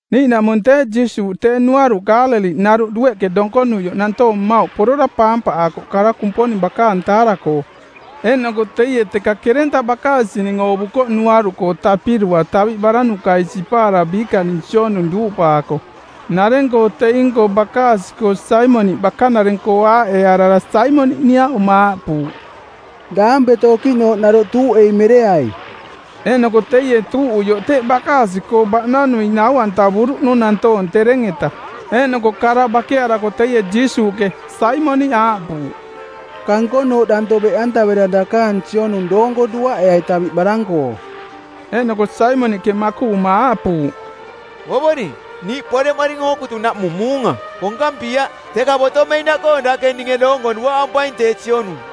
Niiꞌnaꞌmung tee Jiisuuꞌ tee nuaruꞌ Kaaleliꞌnaruꞌ dueꞌke donkonuioꞌ nantoong mmauꞌ porora paampaꞌaakoꞌ kara Kumponing bakaang taara-koo. Eeꞌnoko teie teka kerenta bakaasining oovukoꞌ nuaruꞌkoo tapirua taviꞌ baranukai sipaara biikaning sionung duuꞌpaako. Nareng-koo teing-koo bakaasi-koo Saimoniꞌ bakanareng-koo aaꞌearara Saimoniꞌ niaꞌuma aaꞌpuuꞌ, “Daampeto okiꞌnooꞌ naroꞌ tuuꞌei mereai.” Eeꞌnoko teie tuuꞌuioꞌ teꞌ bakaasi-koo baꞌnanui nau-antavuruꞌnung nantoong tereng-eta. Eeꞌnoko kara bakearako teie Jiisuuꞌke Saimoniꞌ aaꞌpuuꞌ, “Kankonooꞌ danto beꞌantavera dakaang sionung doonko duaꞌeai taviꞌ barang-koo.” Eeꞌnoko Saimoniꞌke makuꞌuma aaꞌpuuꞌ, “Ovoring, niiꞌ poreꞌmoring ookutunaꞌmung muunga. Konkampiaꞌ, teka botomeinaꞌkoo dake ninge doonko duaꞌampaing tee sionung.”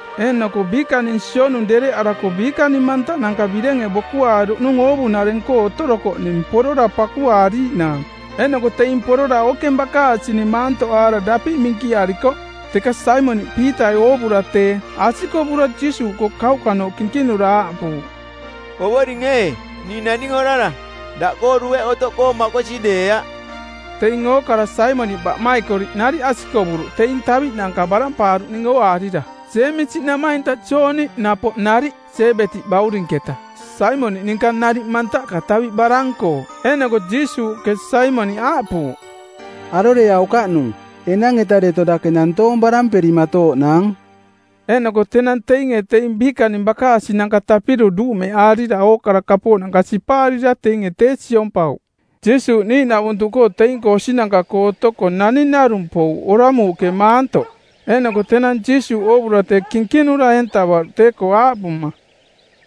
Eeꞌnoko biikaang sionung dererereꞌarako biikaning mantaꞌnanka birenge bokuaaruꞌnung oovunareng-koo otorokoꞌning porora pakuaariiꞌnaang. Eeꞌnoko teing porora ookeng bakaasining maantoꞌaara dapiꞌ minkiarikoꞌ. Teka Saimoniꞌ Piitai oovura tee, asikovura Jiisuuꞌkoo kauꞌkanooꞌ kinkinura aaꞌpuuꞌ, “Ovoring ee, ning naning orara, daꞌkoo dueꞌ otoꞌkoo makosi deeaꞌ.” Teing ookara Saimoniꞌ baꞌmaikoriꞌ nariꞌ asikovuruꞌ teing taviꞌnanka barampaaruꞌning ooaarira. Jeemisi namainta Jooni napoꞌ nariꞌ, Sebetiꞌ baurinketa, Saimoniꞌ ninka nariꞌ mantaꞌka taviꞌ barang-koo. Eeꞌnoko Jiisuuꞌke Saimoniꞌ aaꞌpuuꞌ, “Aroreaukaꞌnung. Enang-eta deto dake nantoong baramperimatooꞌnaang.” Eeꞌnoko tenang teinge teing biikaning bakaasinanka tapiru duumeaarira˜ ookara kapooꞌ sipaarira teinge tee siompauꞌ. Jiisuuꞌ niiꞌnavuntuꞌkoo teing-koo osinanka-koo otoko naning narung pouꞌ oramuuꞌke maantoꞌ. Eeꞌnoko tenang Jiisuuꞌ oovura tee kinkinura eentavaruꞌ tee-koo, aaꞌpuma,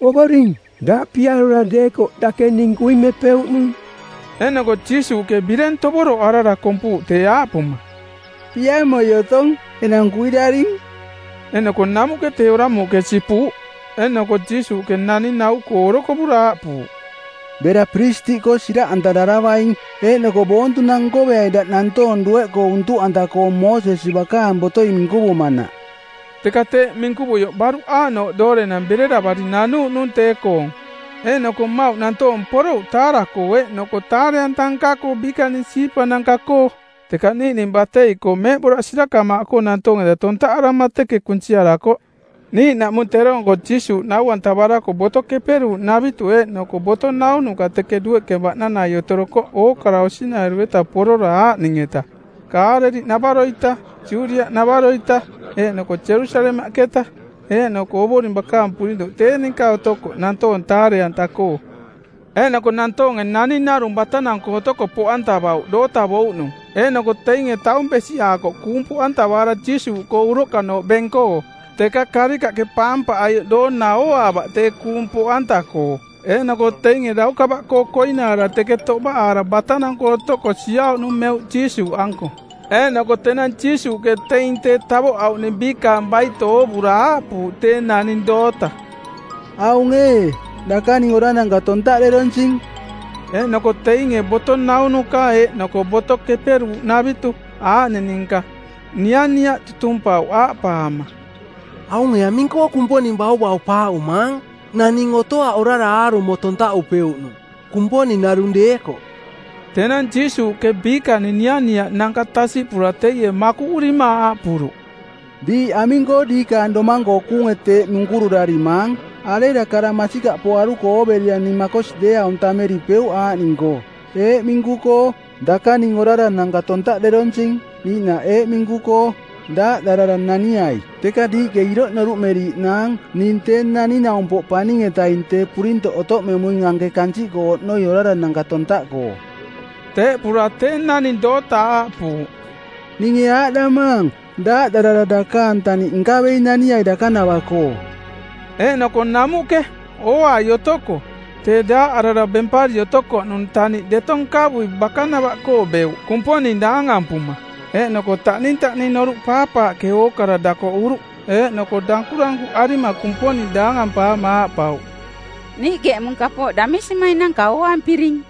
“Ovoring, daꞌ piarora deekoꞌ dake ning kuimepeuꞌnung.” Eeꞌnoko Jiisuuꞌke bireng tovoroꞌarara kompuuꞌ tee, aaꞌpuma, “Piamoi otong. Enang kuiraring!” Eeꞌnoko namuꞌke tee oramuuꞌke sipuuꞌ. Eeꞌnoko Jiisuuꞌke naning nau-koo orokovura aaꞌpuuꞌ, “Bera piristiꞌkoo siraꞌantararavaing eeꞌnoko boontunang nkoveai daꞌ nantoong dueꞌkoo untuꞌanta-koong Moosesi bakaang botoi minkuvumanaꞌ.” Teka teeꞌ minkuvuioꞌ baruꞌ aaꞌnooꞌ doorenang bereravari nanuuꞌnung tee-koong, eeꞌnoko mmauꞌ nantoong porouꞌ taara-koo eeꞌnoko taare-anta nka-koo biikaning siipananka-koo. Teka niiꞌning batei-koo meeꞌboraꞌ sirakamaaꞌkoo nantoong-eta tontaꞌarama teke kunsiarakoꞌ. Niiꞌnaꞌmung teroong-koo Jiisuuꞌ nau-antavarako Boto Keperuuꞌnavitu eeꞌnoko boto naunuka teke dueꞌke baꞌnanai otorokoꞌ ookara osinairu-eta porora aaꞌning-eta: Kaaleliꞌnavaro-ita, Judiaꞌnavaro-ita, eeꞌnoko Jerusalemaꞌketa. Eeꞌnoko Ovoring bakaang purintoꞌ tee ninka otokoꞌ nantoong taare-anta-koo. Eeꞌnoko nantoonge naning narung batanang-koo otoko poꞌantavauꞌ dootavouꞌnung. Eeꞌnoko teinge taung besiꞌaakoꞌ kuung poꞌantavaara Jiisuuꞌkoo uroꞌkanooꞌ beng-koo. Teka karikaꞌke paampaꞌaioꞌ doona ooaavaꞌ tee kuung poꞌanta-koo, eeꞌnoko teinge daukava-koo koinaara teke toꞌbaꞌaara batanang-koo otoko siauꞌnung meuꞌ Jiisuuꞌanko. Eeꞌnoko tenang Jiisuuꞌke teing tee tavoꞌauꞌning biikaang baito oovura aaꞌpuuꞌ tee naning doota, “Aung ee, dakaning orarananka tontaꞌderonsing.” Eeꞌnoko teinge boto naunuka eeꞌnoko Boto Keperuuꞌnavitu˜ aaꞌning ninka nianiaꞌ tutumpauꞌ aaꞌpaama, “Aunge aming-koo Kumponing bauvaupaaꞌumaang? Naning otoaꞌ orara aarumo tontaꞌupeuꞌnung, Kumponing narung deekoꞌ.” Tenang Jiisuuꞌke biikaning nianiaꞌnanka tasiꞌpura teie makuꞌurima aaꞌpuruꞌ, “Diiꞌ aming-koo diikaang domang-koo kuunge teeꞌ munkururarimaang? Arera kara masikaꞌpoaruko ooverira ning makosi deeaung tammeripeuꞌ aaꞌning-koo, eeꞌ minku-koo, ‘Dakaning orarananka tontaꞌderonsing,’ niiꞌnaꞌ eeꞌ minku-koo, ‘Daaꞌdarara naniai.’? Teka diiꞌke iroꞌ noruꞌmeriiꞌnaang ning Tee Naning-naumpoꞌ Paning-etaing tee purintoꞌ otoꞌmemuing anke kansiꞌkoo oꞌnoi orarananka tontaꞌkoo...” Teeꞌpura tee naning doota aaꞌpuuꞌ, “Ninge aaꞌdamaang, ‘Daaꞌdarara dakaang taniꞌ nkavei naniai dakanava-koo.’” Eeꞌnoko namuꞌke, ooai otoko, tee daaꞌarara bempari otokoꞌnung taniꞌ deto nkavui bakanava-koo beuꞌ, Kumponing daangampuma. Eeꞌnoko taꞌnintaꞌning noruꞌ paapaaꞌke ookara dakoꞌuruꞌ eeꞌnoko dankurankuꞌarima Kumponing daangampaama aaꞌpauꞌ, “Niiꞌke eꞌmung kapooꞌ damisimainanka ooampiring.”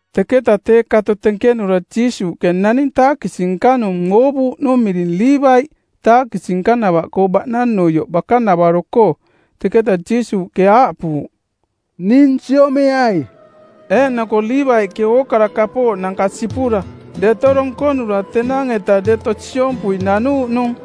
Teketa tee kato tenkenura Jiisuuꞌke naning taakisi-nka-nung oovuuꞌnung miring Liivaiꞌ, taakisi nkavaakoꞌnava-koo baꞌnanuioꞌ bakanavaro-koo. Teketa Jiisuuꞌke aaꞌpuuꞌ, “Ning siomeai.” Eeꞌnoko Liivaiꞌke ookara kapooꞌnanka sipura, deto donkonura tenang-eta deto tee siompui nanuuꞌnung.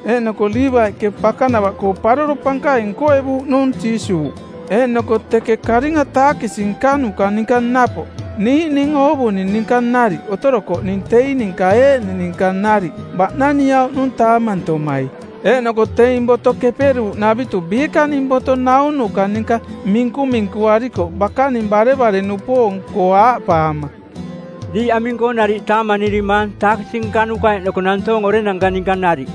Eeꞌnoko Liivaiꞌke bakanava-koo paroro pankaing nkoevuuꞌnung Jiisuuꞌ. Eeꞌnoko teke karinga taakisi nkanuka ninka napoꞌ niiꞌning oovuning ninka nariꞌ otorokoꞌning teing ninka eeꞌning ninka nariꞌ baꞌnaniauꞌnung taamantomai. Eeꞌnoko teing Boto Keperuuꞌnavitu biikaning boto naunuka ninka minkuminkuaarikoꞌ bakaning barevare-nupoong-koo aaꞌpaama, “Diiꞌ aming-koo nariꞌ taamanirimaang taakisi nkanuka eeꞌnoko nantoong orenanka ninka nariꞌ?”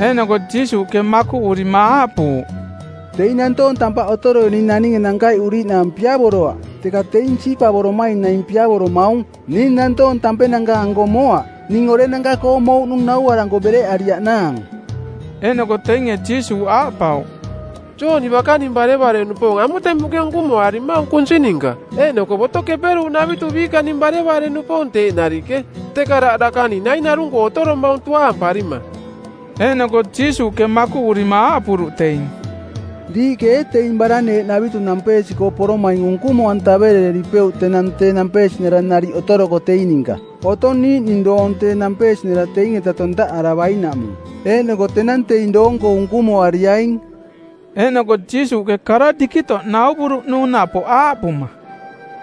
Eeꞌnoko Jiisuuꞌke makuꞌurima aaꞌpuuꞌ, “Teing nantoong tampaꞌ otoroining naninge nankaiꞌuriiꞌnaang piavoroaꞌ, teka teing siipavoromaing naing piavoromaung. Ning nantoong tampenanka-anko moaꞌ. Ning orenanka-koo mouꞌnung nauaranko bereꞌariaꞌnaang.” Eeꞌnoko teinge Jiisuuꞌ aaꞌpauꞌ, “Jooni bakaning barevare-nupoong amutemuꞌke unkumoarimaung kunsi ninka, eeꞌnoko Boto Keperuuꞌnavitu biikaning barevare-nupoong teeꞌ nariꞌke, teka daꞌ dakaning nai narung-koo otoromaung tuaamparima.” Eeꞌnoko Jiisuuꞌke makuꞌurima aaꞌpuruꞌ teing, “Diiꞌke ee teing baraneeꞌnavitu nampeesi-koo poromaing unkumo-antaverereripeuꞌ tenang tee nampeesinara nariꞌ otoroko teing ninka? Otong niiꞌning doong tee nampeesinara teing-eta tontaꞌaravainaꞌmung. Eeꞌnoko tenang teing doong-koo unkumoariaing.” Eeꞌnoko Jiisuuꞌke kara dikitoꞌ nauvuruꞌnung napoꞌ, aaꞌpuma,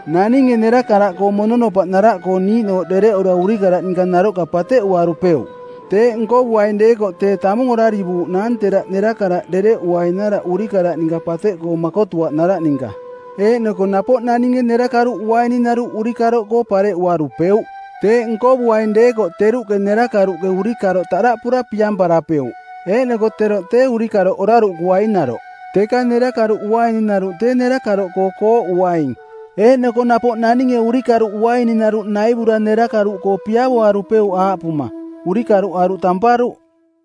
“Naninge nerakaraꞌkoo mononopaꞌnaraꞌkoo niiꞌnooꞌ dereꞌura urikaraꞌ ninka naroꞌka pateꞌuarupeuꞌ. Teeꞌ nkovuaing deekoꞌ tee tamung orarivuuꞌnaang teraꞌ nerakaraꞌ dereꞌuinaraꞌ urikaraꞌ ninka pateꞌkoo makotuaꞌnaraꞌ ninka. Eeꞌnoko napoꞌ naninge nerakaruꞌ uaininaruꞌ urikaroꞌkoo kooꞌuarupeuꞌ. Teeꞌ nkovuaing deekoꞌ teruꞌke nerakaruꞌke urikaroꞌ taꞌdaꞌpura piamparapeuꞌ eeꞌnoko teroꞌ tee urikaroꞌ oraruꞌkuainaroꞌ. Teka nerakaruꞌ uaininaruꞌ tee nerakaroꞌkoo kooꞌuaing. Eeꞌnoko napoꞌ naninge urikaruꞌ uaininaruꞌ naivura nerakaruꞌkoo piavoarupeuꞌ aaꞌpuma, ‘Urikaruꞌ aruꞌ tamparuꞌ.’”